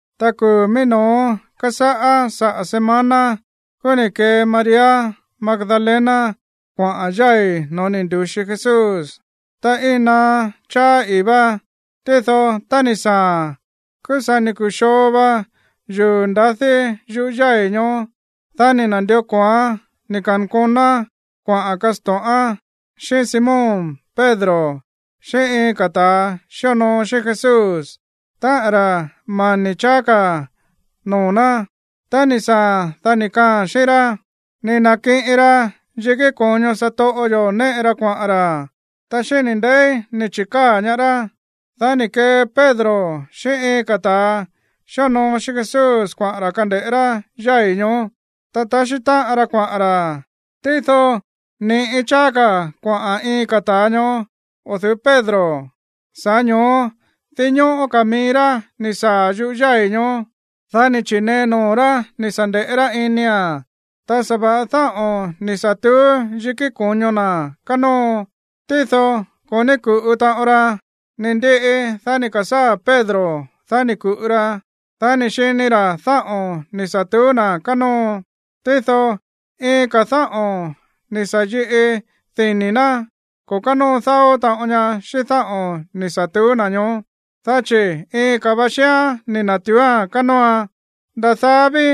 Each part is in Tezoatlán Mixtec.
Ta kuu̱ mií no̱ó kásáꞌá saꞌa̱ semana, kúú ni̱ kee María Magdalena kuaꞌa̱n yái̱ no̱ó ni̱ ndu̱xi Jesús, ta iin naá cháá ii̱ vá. Tído tá ni̱ saa̱a̱n, kúú sa̱ ni̱ ku̱xoo va yuu̱ ndadí yuꞌú yái̱ ñoó. Dá ni̱ na̱ndió ko̱oán ni̱ ka̱nkonoán kuaꞌa̱n kasto̱ꞌán xíꞌín Simón Pedro xíꞌín iin ka̱ ta̱ xíonoo xíꞌín Jesús, táꞌa̱n ra̱ mani̱ cháá ka̱ noo̱ ná. Tá ni̱ saa̱a̱n, dá ni̱ kaaa̱n xíꞌín rá: ―Ni̱ na̱kiꞌin ra yikí ko̱ño satoꞌo yo̱ néꞌe ra kuaꞌa̱n ra̱, ta xíni̱ ndeí ni̱ chi̱káa̱ ñaá rá. Dá ni̱ kee Pedro xíꞌín iin ka̱ ta̱ xíonoo xíꞌín Jesús kuaꞌa̱n ra̱ kande̱ꞌé rá yái̱ ñoó. Ta taxí táꞌan ra kuaꞌa̱n ra̱, tído ni̱ꞌi cháá ka̱ kuaꞌa̱n iin ka̱ ta̱a ñoó o̱ du̱ú Pedro. Sa̱ꞌá ño̱ó dinñóꞌó ka̱ mií rá ni̱ saa̱ yúꞌu̱ yái̱ ñoó. Dá ni̱ chi̱nee noo̱ rá ni̱ sa̱ nde̱ꞌé rá inia̱n. Ta sa̱va̱ꞌa dáꞌo̱n ni̱ sa̱ tuú yikí ko̱ño na̱ kánóo, tído ko̱ ní ku̱ꞌu taꞌon ra. Ni̱ ndiꞌi, dá ni̱ ka̱sáa̱ Pedro. Dá ni̱ ku̱ꞌu ra, dá ni̱ xini ra̱ dáꞌo̱n ni̱ sa̱ tuú na̱ kánóo. Tído iin ka̱ dáꞌo̱n ni̱ sa̱ yiꞌi dini̱ ná ko̱ kánóo dáó taꞌon ña xíꞌín dáꞌo̱n ni̱ sa̱ tuú na̱ ñoó. Dá chi̱ iin ka̱ va xíán ni̱ na̱tuúa̱n kánóoan. Nda̱ daá ví,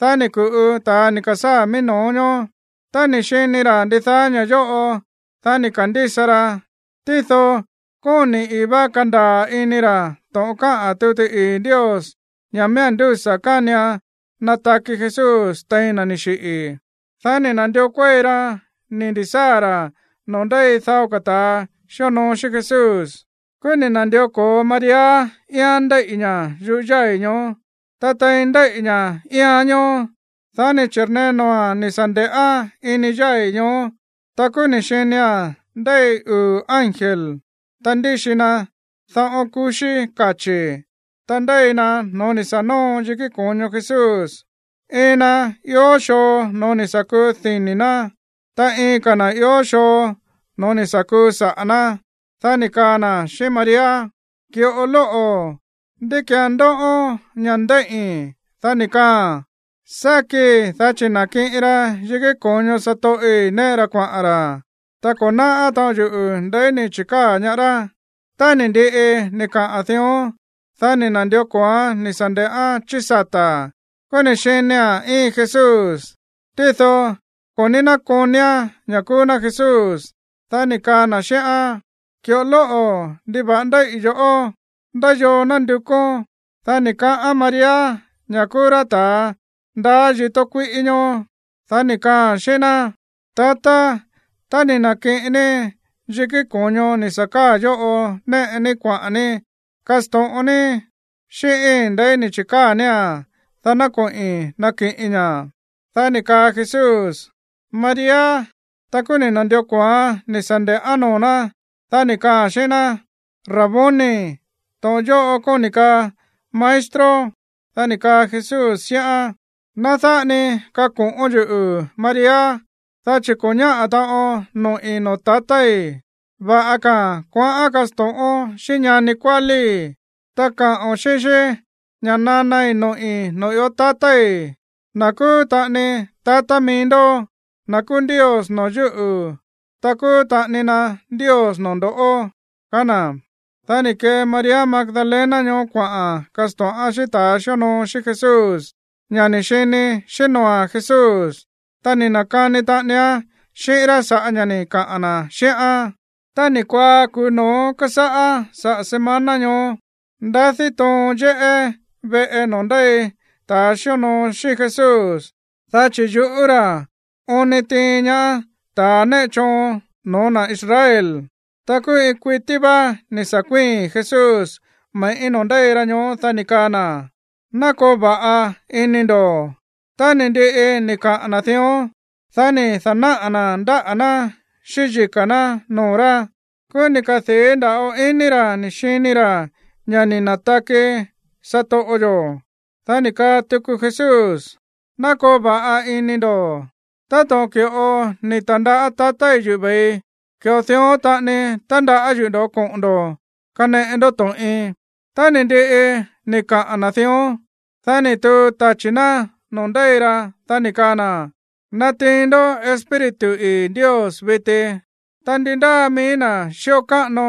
dá ni̱ ku̱ꞌu ta̱a ni̱ ka̱sáa̱ mií no̱ó ñoó. Tá ni̱ xini ra̱ ndidaá ña̱ yóꞌo, dá ni̱ ka̱ndísa ra. Tído kóni̱ ii̱ vá kandaa̱ ini ra̱ to̱ꞌon káꞌa̱n tuti ii̱ Ndios ña̱ miía̱n ndúsa̱ kánian nataki Jesús tein na̱ ni̱ xiꞌi̱. Dá ni̱ na̱ndió kuéi ra ni̱ ndi̱sáa̱ ra̱ noo̱ ndéi dao ka̱ ta̱ xíonoo xíꞌín Jesús. Kúú ni̱ na̱ndió ko̱o María íián ndéíꞌi̱ ña̱ yuꞌú yái̱ ñoó. Ta tein ndéíꞌi̱ ña̱ íián ñoó, dá ni̱ chi̱rnee noo̱a̱n ni̱ sa̱ nde̱ꞌán ini yái̱ ñoó. Ta kúú ni̱ xinia̱n ndéi uu̱ ángel, ta ndíxi na daꞌón kuxí kachi̱. Ta ndéi na no̱ó ni̱ sa̱ nóo yikí ko̱ño Jesús. Iin na ió xoo noo̱ ni̱ sa̱ kuu dini̱ ná, ta iin ka̱ na̱ ió xoo no̱ó ni̱ sa̱ kuu saꞌa̱ ná. Dá ni̱ kaa na̱ xíꞌín María: ―Ki̱ꞌo lóꞌo̱, ¿ndí ki̱án ndóꞌón ña̱ ndéíꞌi̱n? Dá ni̱ kaaa̱n: ―Sákii, dá chi̱ ni̱ na̱kiꞌin ra yikí ko̱ño satoꞌi̱ néꞌe ra kuaꞌa̱n ra̱, ta ko̱ náꞌá taꞌon yuꞌu̱ ndeí ni̱ chi̱káa̱ ñaá rá. Tá ni̱ ndiꞌi ni̱ kaꞌa̱n dión, dá ni̱ na̱ndió ko̱oán ni̱ sa̱ nde̱ꞌán chí sata̱, kúú ni̱ xinia̱n íin Jesús, tído ko̱ ní nákonia̱n ña̱ kúú ná Jesús. Dá ni̱ kaa na̱ xíꞌán: ―Ki̱ꞌo lóꞌo̱, ¿ndiva̱ꞌa ndéíꞌi̱ yo̱ꞌó? ¿Ndá yoo nándukón? Dá ni̱ kaꞌán María ña̱ kúú rá ta̱ ndaá yitó kuíꞌí ñoó. Dá ni̱ kaaa̱n xíꞌín ná: ―Tatá, tá ni̱ na̱kiꞌin ní yikí ko̱ño ni̱ sa̱ káa̱ yóꞌo néꞌe ní kuaꞌa̱n ní, kasto̱ꞌon ní xíꞌíín ndeí ni̱ chi̱káa̱ nía̱n, dá ná koꞌi̱n nakiꞌiin ña̱. Dá ni̱ kaa Jesús: ―¡María! Ta kúú ni̱ na̱ndió ko̱oán ni̱ sa̱ nde̱ꞌán noo̱ ná, dá ni̱ kaaa̱n xíꞌín ná: ―¡Raboni! (To̱ꞌon yóꞌo kóni̱ kaa maestro.) Dá ni̱ kaa Jesús xíꞌán: ―Ná dáꞌa ni kako̱ꞌón yuꞌu̱, María, dá chi̱ ko̱ ñáꞌa̱ taꞌon noꞌi̱ noo̱ tatái̱. Va̱ꞌa ka̱a̱n kuaꞌán kasto̱ꞌón xíꞌín ñani kuálíí, ta kaꞌo̱n xíꞌín xí ña̱ nanai noꞌi̱ noo̱ ió tatái̱, na̱ kúú taꞌani tatá mií ndó, na̱ kúú Ndios noo̱ yúꞌu̱, ta kúú taꞌani na Ndios noo̱ ndo̱ꞌó ―kaá na̱. Dá ni̱ kee María Magdalena ñoó kuaꞌa̱n kasto̱ꞌán xíꞌín ta̱ xíonoo xíꞌín Jesús ña̱ ni̱ xini xíꞌín noo̱a̱n Jesús, ta ni̱ na̱kani taꞌanián xíꞌín rá sa̱ꞌá ña̱ꞌa ni̱ kaꞌa̱n na̱ xíꞌán. Tá ni̱ kuaá kuu̱ no̱ó kásáꞌá saꞌa̱ semana ñoó, ndadí toon yéꞌé veꞌe noo̱ ndéi ta̱ xíonoo xíꞌín Jesús, dá chi̱ yuꞌú ra̱ oon ni tiin ñaá ta̱ néꞌe choon no̱ó na̱ Israel. Ta kúú iin kuití vá ni̱ sa̱ kuíi̱n Jesús me̱ꞌí noo̱ ndéi ra ñoó. Dá ni̱ kaa na̱: ―Ná koo va̱ꞌa ini ndo̱. Tá ni̱ ndiꞌi ni̱ kaꞌa̱n na̱ dión, dá ni̱ da̱náꞌa̱ na̱ ndáꞌa̱ ná xíꞌín yika̱ ná noo̱ rá. Kúú ni̱ kadii̱ nda̱ꞌo ini ra̱ ni̱ xini ra̱ ña̱ ni̱ na̱taki satoꞌo yo̱. Dá ni̱ kaa tuku Jesús: ―Ná koo va̱ꞌa ini ndo̱. Táto̱ꞌon ki̱ꞌo ni̱ ta̱ndaꞌá tatái̱ yuꞌu̱ ve̱ii, ki̱ꞌo dión taꞌani tandaꞌá yuꞌu̱ ndo̱ꞌó koꞌo̱n ndo̱ kaneꞌe ndó to̱ꞌin. Tá ni̱ ndiꞌi ni̱ kaꞌa̱n na̱ dión, dá ni̱ tuu tachi̱ ná noo̱ ndéi ra, dá ni̱ kaa na̱: ―Natiin ndó Espíritu ii̱ Ndios viti. Tá ndi ndáa mií na̱ xíꞌo káꞌano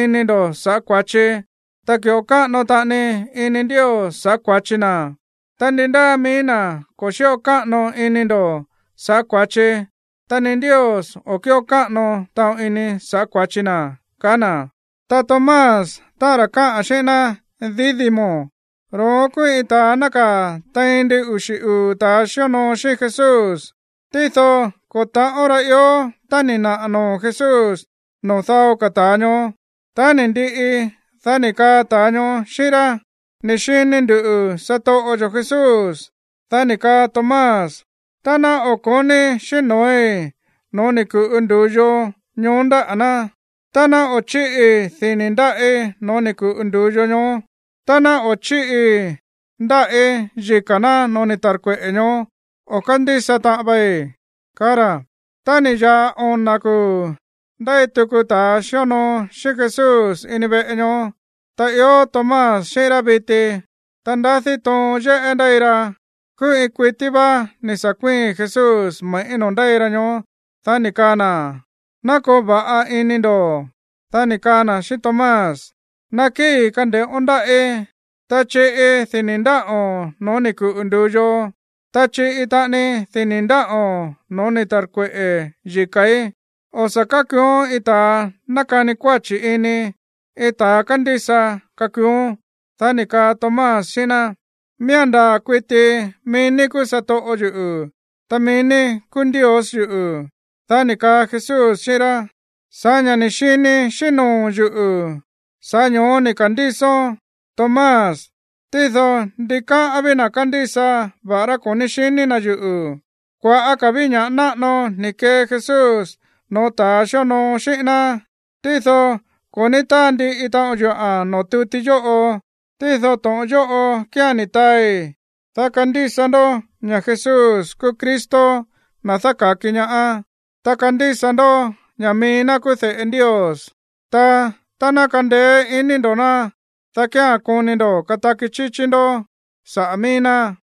ini ndo̱ sa̱ꞌá kua̱chi, ta ki̱ꞌo káꞌano taꞌani ini Ndios sa̱ꞌá kua̱chi na. Ta ndi ndáa mií na̱ ko̱ xíꞌo káꞌano ini ndo̱ sa̱ꞌá kua̱chi, ta ni Ndios o̱ kíꞌo káꞌano taꞌon ini sa̱ꞌá kua̱chi na ―kaá na̱. Ta Tomás, táꞌa̱n ra̱ káꞌa̱n xíꞌín ná Dídimo, ro̱ón kúú iin ta̱a nákaa̱ tein ndin uxi̱ uu̱ ta̱ xíonoo xíꞌín Jesús, tído ko̱ ta̱ꞌón ra ió tá ni̱ naꞌa̱ noo̱ Jesús noo̱ dao ka̱ ta̱a ñoó. Tá ni̱ ndiꞌi, dá ni̱ kaa ta̱a ñoó xíꞌín rá: ―¡Ni̱ xini ndu̱ satoꞌo yo̱ Jesús! Dá ni̱ kaa Tomás: ―Ta ná o̱ ko̱níi̱ xíꞌín noo̱í no̱ó ni̱ ku̱ꞌu ndu̱yo ñoó ndáꞌa̱ ná, ta ná o̱ chíꞌii dini̱ ndáꞌí no̱ó ni̱ ku̱ꞌu ndu̱yo ñoó, ta ná o̱ chíꞌii ndáꞌí yika̱ ná no̱ó ni̱ ta̱rkueꞌe̱ ñoó, o̱ kándísa taꞌon vei ―kaá ra̱. Tá ni̱ ya̱ꞌa ona̱ kuu̱, ndéi tuku ta̱ xíonoo xíꞌín Jesús ini veꞌe ñoó, ta ió Tomás xíꞌín rá viti. Ta ndadí toon yéꞌé ndéi ra. Kúú iin kuití vá ni̱ sa̱ kuíi̱n Jesús me̱ꞌí noo̱ ndéi ra ñoó, dá ni̱ kaa na̱: ―Ná koo va̱ꞌa ini ndo̱. Dá ni̱ kaa na̱ xíꞌín Tomás: ―Nakíi̱, kande̱ꞌón ndáꞌí, ta chiꞌi dini̱ ndáꞌo̱n no̱ó ni̱ ku̱ꞌu ndu̱yo, ta chiꞌi taꞌani dini̱ ndáꞌo̱n no̱ó ni̱ ta̱rkueꞌe̱ yika̱í. O̱ sa̱ kákuuón iin ta̱ nákani kuáchi̱ ini, iin ta̱a kandísa kakuuón. Dá ni̱ kaa Tomás xíꞌín ná: ―Miía̱n ndaa̱ kuiti mií ní kúú satoꞌo yuꞌu̱, ta mií ní kúú Ndios yuꞌu̱. Dá ni̱ kaa Jesús xíꞌín rá: ―Sa̱ꞌá ña̱ ni̱ xini xíꞌín noo̱o̱n yuꞌu̱, sa̱ꞌá ño̱ó ni̱ ka̱ndísón, Tomás. Tído ndikáꞌán ví na̱ kándísa va̱ꞌará ko̱ ní xiní na̱ yuꞌu̱. Kua̱ꞌá ka̱ ví ña̱ꞌa náꞌano ni̱ kee Jesús no̱ó ta̱ xíonoo xíꞌín ná, tído ko̱ ní táa ndiꞌi taꞌon yuꞌa̱n noo̱ tuti yóꞌo. Tído to̱ꞌon yóꞌo kía̱n ni̱ taai, dá kandísa ndó ña̱ Jesús kúú Cristo, na̱ dáka̱ki ñaá, ta kandísa ndó ña̱ mií ná kúú de̱ꞌe Ndios. Ta tá ná kandeé iní ndo̱ ná, dá kía̱n koni ndo̱ kataki chíchí ndó saꞌa̱ mií ná.